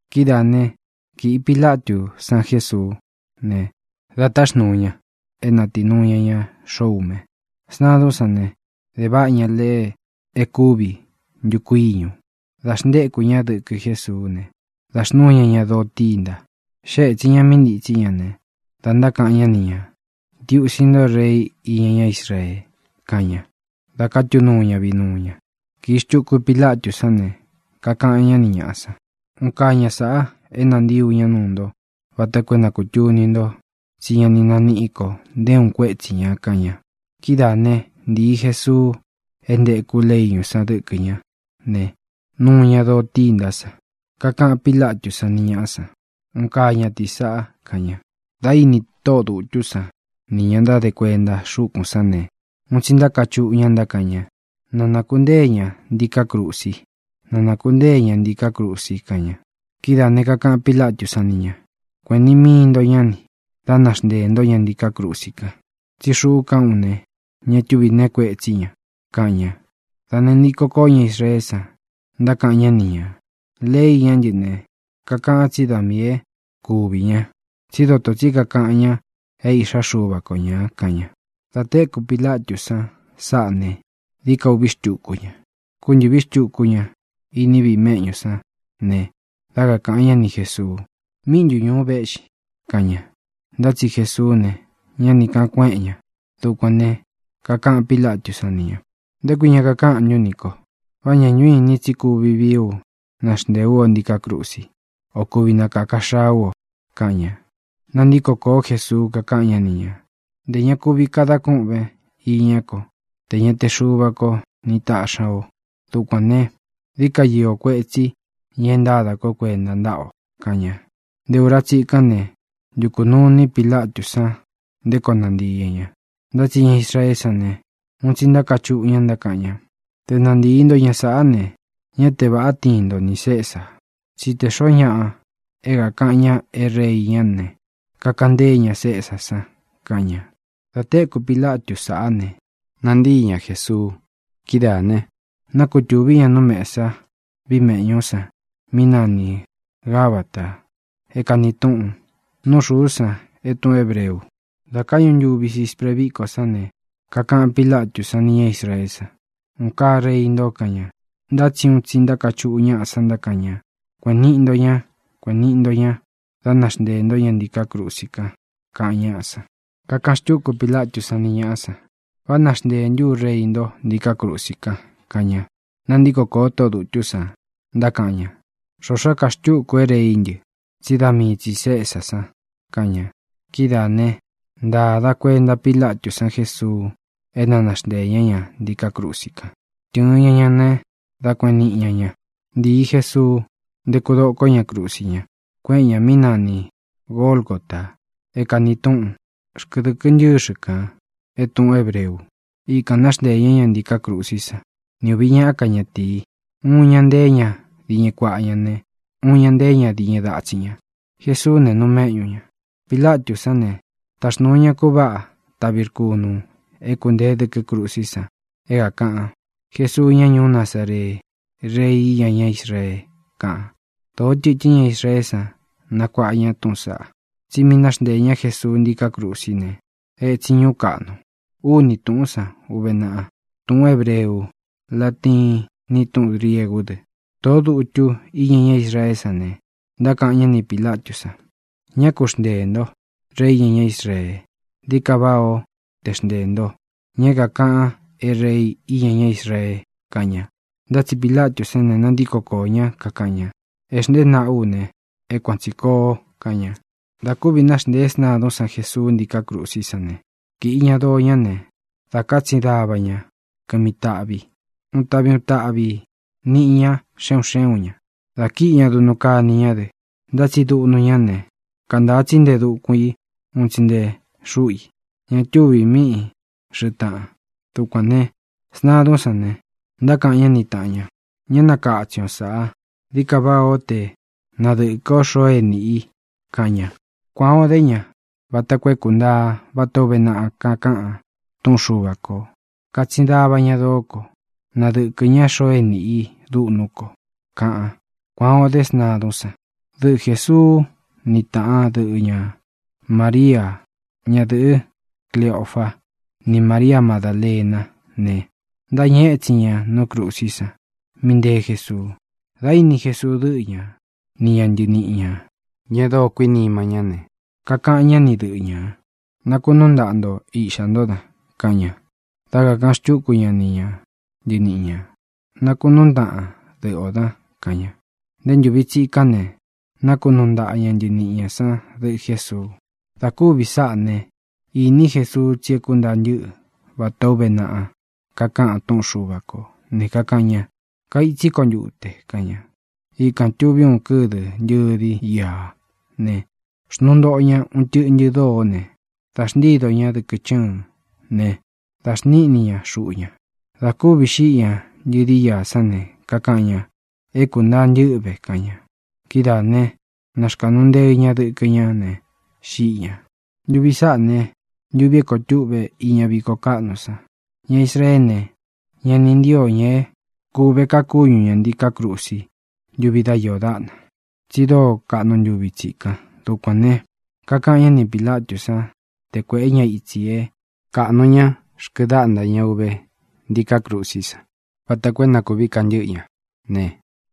Kidáā né, kīꞌi Pilatú san Jesuú ne, da táxnūu ña é natīnuu ña ña xoꞌo ume. Sntadún san ne, de váꞌa ña leꞌe e kúvi ntuku íñu, da xntéku ña dɨkɨ Jésuú ne, da xnúu ña ña doo tînta. Xée ētsin ña mí ntītsí ña ne, da ntákaꞌan ñá ni ñā: —¡Ntiusi ntó, Rei iña ñá Israee! —kaꞌan ñá, dā kátu nuu ña vinuu ña. Kīi xtuku Pilatú san ne, kakaꞌan ñá ni ñāꞌa san: —Un kaa ña sāꞌa é nantii ú ña nuu nto vata koo é na kūtuni nto tsí ña ni naníꞌi ko nté uun kuétsi ñā —kaꞌan ña. Kidáa ne, ntīi Jesuu é ntēku leꞌe íñu san dɨkɨ ñá ne, nuu ña doo tîntá san. Kakaꞌan Pílatú san ni ñāꞌa san: —¡Un kaa ñatīi saꞌa! —kaꞌan ña. Dá ini tóꞌō dutú san nī ña ntáde kuenta xúkūn sán ne, un tsi ntákachuꞌu ña ntákaꞌan ña: —¡Na nākuntée ña ntiká krusi! ¡Na nākuntée ña ntiká krusi! —kaꞌan ña. Kidáā ne, kakaꞌan Pílatú san ni ñā: —Kuēꞌen niꞌi mii nto ñá ni, dá naxnteē ntó ña ntiká krusi kan. Tsí xuꞌú kaꞌán u ne, ña túvī nee kuetsí ña —kaꞌan ña. Dā nantíko kōó ña Israeé san, ntákaꞌan ñá ni ñā: —Lei iñá ntɨ ne, kakaꞌan tsí da miī é kuvī ña, tsí dotō tsí kakaꞌan ña é Īꞌxá Xuva ko ñā —kaꞌan ña. Dā téku Pilatú san sáꞌa ne, dií ka ūꞌvi xtúku ña. Kúntɨ̄ꞌví xtuku ña iní viꞌi meꞌñú san ne, dá kakāꞌan ñá ni Jēsuu: —¿Míꞌi ntu ñūu véꞌxin? —kaꞌan ña. Ntá tsi Jesuú ne, ñá ni kāꞌan kueꞌen ña. Dukuān ne, kakaꞌan Pílatú san ni ñā: —¿Nté kui ña kakáꞌan ntún nī ko? ¿Vá ña ntu ínin tsí kuvi vií u naxntēe ú o ntiká krusí, o kuvi nakāka xaa ú o? —kaꞌan ña. Nantíko kōó Jesuu, kakáꞌan ñá ni ñā: —Ntē ña kuvi kadan kúꞌven īñá ko tē ña te Xuva ko ni taꞌxi ña o. Dukuān ne, dií ka iō kuetsí ña e ntáda kó kuenta ntáꞌa o —kaꞌan ña. Nté ūra tsikán ne, ntukū nuu iní Pilatú san nté koo nantīi ña ña. Ntá tsi ña Israeé san ne, un tsi ntákachuꞌu ña ntákaꞌan ña: —¡Te nantii nto ña sāꞌá ne, ñá te vāꞌá tiin nto nī Cesa! tsí te xōo ñáꞌa é kākaꞌan ña é rei ñá ne, kakaꞌan ntée ña Cesá san —kaꞌan ña. Dā téku Pilatu sáꞌa ne, nantíi ña Jēsuu. Kidáā ne, nákutūví ña nú mesa víꞌi meꞌñú san mí nani Gābata, é kāni túꞌun Nú Xūú san é tūꞌun hébreu. Dā káꞌñu ntuvi sispre víkó san ne, kakaꞌan Pílatú san nī ña Israeé san: —¡Un kaa rei nto! —kaꞌan ña. Ntá tsi un tsi ntákachuꞌu ñaꞌa san ntákaꞌan ña: —¡Kuēꞌen niꞌi ntó ña! ¡Kuēꞌen niꞌi ntó ña! ¡Dá naxnteē ntó ña ntiká krusi kan! —kaꞌan ñáꞌa san. Kakaꞌan xtúku Pilatú san ni ñāꞌa san: —¿Vá naxntēe ntú u rei nto ntíkā krusi kan? —kaꞌan ña. Nántiko kōo tóꞌō dutú san, ntákaꞌan ña: —Xoxó ka xtúku é reí ntɨ, tsí da mii tsī Cesá san —kaꞌan ña. Kidáā né, ntāda kuenta Pílatú san Jésuu é na naxnteē ñá ña ntiká krusi kan. Tɨ̄ɨn ña ña né, dā kueꞌen niꞌi ña ña. Ntīi Jesuu, ntéku dokó ña krusi ña, kueꞌen ña mí nani Gōlgota é kāni túꞌun Xkɨdɨkɨ Ntɨ́xɨ kān é tūꞌun hébreu. Ikān náxnteē ñá ña ntiká krusí san ni ūvi ñaꞌá ka ñatīi. Uun ña nteé ña diñɨ kuaꞌa ña ne, uun ña nteé ña diñɨ datsín ña. Jēsuú ne, nuu méꞌñu ña. Pilatú san ne, táxnūu ña kuváꞌa taꞌvi rkunū é kuntēé dɨkɨ́ krusí san é kākaꞌan: “Jesuu, ñá ñuú Nazaree, Rei iña ñá Israee”, kaꞌan. Dōó tɨtɨ́n ña Israeé san nakuáꞌa ña túꞌūn saꞌá, tsí mi náxnteē ñá Jesuu ntiká krusí ne, ētsin ñuú kaꞌnu. Úni tūꞌún san uve naꞌa: túꞌun hēbreu, latiín, ni tūꞌún griegú dɨ. Tōꞌó dutu íña ñá Israeé san ne, ntákaꞌan ñá ni Pīlatú san: —Ñá ku xnteē nto: “Rei iña ñá Israee”. Dií ka váꞌā ó te xnteē nto: “Ña é kākaꞌan é Rei iña ñá Israee” —kaꞌan ña. Ntá tsi Pilatú san ne, nantíko koō ñá, kakaꞌan ña: —Ē xntée naꞌa ú ne, é kuan tsī koo —kaꞌan ña. Dā kúvī náxntēé sntadún san Jesuu ntiká krusí san ne, kīꞌi ña doo ñá ne, dā kátsin dava ña kɨmi taꞌvi. Uun taꞌvi uun taꞌvī niꞌi ñá xe un xé un ñā. Dā kíꞌi ña duꞌnu kani ñá dɨ, ntá tsi duꞌnu ñá ne, kantāa tsi nte dukun i un tsi nte xúꞌu i; ña túvī míꞌi xɨ̄ꞌɨ taꞌan. Dukuān ne, sntadún san ne, ntákaꞌan ñá ni tāꞌan ña: —Ñá nakatsin o sāꞌa; dií ka váꞌā ó te nadɨ̄kɨ ó xoo e níꞌi i —kaꞌan ña. Kuan ō dé ña vata koo é kuntaa vatā ó uve naꞌa kakaꞌan túꞌun Xuva kō: “Kātsin dava ña doó ko. Nadɨkɨ ña xoo é nīꞌi i dúꞌnú ko”, kaꞌan. Kuān o dé sntadún san. Dɨꞌɨ Jēsuu ni taꞌan dɨ́ꞌɨ ña, María, ñadɨ̄ꞌɨ Cliofa, ni María Madālená ne, ntáñɨ étsin ña nú krusí san mí ntēé Jesuu. Dā íni Jesuu dɨ́ꞌɨ ña ni ña ntɨniꞌi ñā, ña e dóo kuinima ñá ne, kakaꞌan ñá ni dɨꞌɨ ñā: —Nakunúu ntaꞌa nto īꞌxá nto dan —kaꞌan ña. Dá kakāꞌan xtúku ña ni ña ntɨniꞌi ñā: —Nakunúun ntaꞌan dɨꞌɨ ō dan —kaꞌan ña. Nté ntūvi tsikán ne, nákunuu ntaꞌa ña ntɨniꞌi ñā sán dɨꞌɨ Jēsuu. Dā kúvī sáꞌa ne, īní Jesuu tsi é kuntaa ntɨ́ꞌɨ vatā ó uve naꞌa kakaꞌan túꞌun Xuva kō ne, kakaꞌan ña: —Kaitsí ko ntute —kaꞌan ña. Ikān tuví uun kɨ́dɨ ntɨ̄di íā ne, xnuu ntoꞌo ña uun tɨꞌntɨ dóó ne, dā xntídō ñá dɨkɨ chɨ́ɨ̄n ne, da xníꞌni ña xuꞌu ña. Dā kúvī xíꞌi ña ntɨ̄di íā sán ne, kakaꞌan ña: —É kūntaa ntɨ́ꞌɨ ve —kaꞌan ña. Kidáā né, nāxkaꞌnu nteɨ ña dɨkɨ ñá ne, xíꞌi ñā. Ntuvi sāꞌá ne, ntuvī é koo tuꞌve iña víko kaꞌnu san. Ña Israeé ne, ña ni ntío ña é kūve ka kúñu ña ntīká krusi ntuvi dá iō dáꞌna, tsi dóo kaꞌnu ntuvi tsikan. Dukuān ne, kakaꞌan ñá ni Pīlatú san te kuēꞌé ña itsi é kaꞌnu ña xkɨdáꞌnta ña uve ntiká krusí san vata koo é na kūví kantɨ́ꞌɨ ña ne,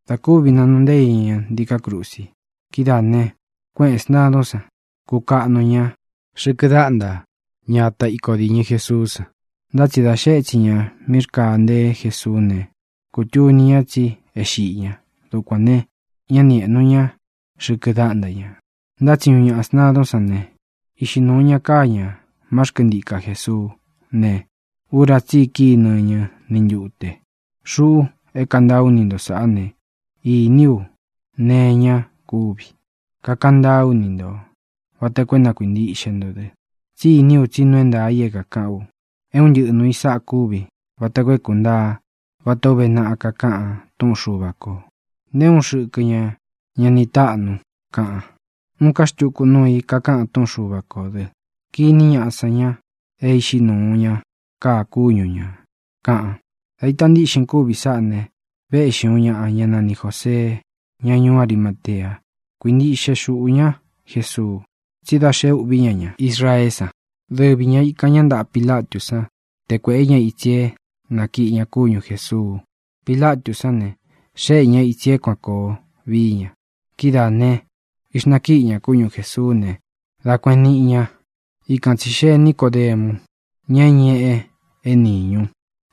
dá kūvi nanuu nteé ña ña ntiká krusi. Kidáā ne, kuéꞌen sntādún san, kukaꞌnu ña xɨ̄kɨ dáꞌnta ña ata iko dīñɨ Jesuú san. Ntá tsi dā xee étsin ña mí rkāa nteé Jesuú ne, kūtuni ña tsi é xiꞌi ña. Dukuān ne, ñá ni ēꞌnu ña xɨkɨ dáꞌnta ña. Ntá tsi uun ñaꞌa sntadún san ne, iꞌxi nūu ña káa ñā má xkɨntika Jēsuú ne, ura tsí i kíi nɨñɨ ni ntute. Xuꞌu é kantaa ú ni nto sāꞌá ne, īní u nee iña kúvi. Kakaꞌan ntáa ú ni ntō vata koo é na kuīntiꞌxe nto dɨ, tsí iní u tsi nuu é ntaā i é kākaꞌán u. É un ntɨꞌɨ nūu i sáꞌa kúvi vata koo é kuntaa vatā ó uve naꞌa kakaꞌan túꞌun Xuva kō: “Nté uun xɨkɨ ña ña ni táꞌnu”, kaꞌan. Uun ká xtuku nuu i kakáꞌan túꞌun Xuva kō dɨ: “Kiní ñaꞌa san ña é iꞌxi nūu ña káa kúñu ñā”, kaꞌan. Dā ita ntíꞌxin kúvi sáꞌa ne, véꞌxi uun ñāꞌa, ñá nani Jōsee, ña ñuú Arimatea. Kuintiꞌxe xuꞌū ña Jesuu tsí da xé ūꞌví ña ña Israeé san. Dɨvi ña īkan ñá ntaꞌa Pilatú san te kuēꞌé ña itsi é nakiꞌi ña kúñu Jēsuu. Pilatú san ne, xéꞌe ña ītsi é kuān koo vií ña. Kidáā ne, ixnakíꞌi ña kúñu Jēsuú ne, dā kueꞌen niꞌi ña. Ikan tsī xee Nícodemu, ña é ñeꞌe é nīñu,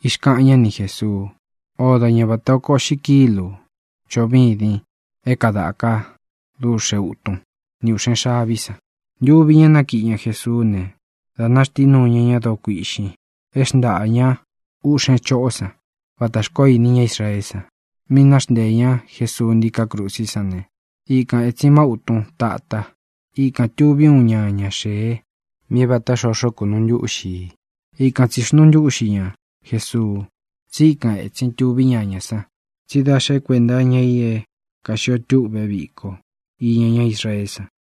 ixkaꞌan ñá ni Jēsuu, ódo ñā vata oko uꞌxi kílū choꞌo vídin é kadāka dúꞌxe utun ni ūꞌxen xaví san. Ntuvi ña nákiꞌi ña Jesuú ne, dā náxtinuu ñá ña doo kuiꞌxin e xntáꞌa ña uꞌxen choꞌó san vatā xkoó ini ñá Israeé san. Mī náxnteē ñá Jesuu ntíká krusí san ne, ikan ētsin má utun tata. Ikān tuví uun ñaña xēe mí é vāta xoxo kunuu ntúꞌxi ī. Ikan tsī xnuu ntúꞌxi ña Jesuu, tsi íkan ētsin tuví ñañā san, tsí da xé kuenta iña i é kāxio tûꞌve víko iña ñá Israeé san.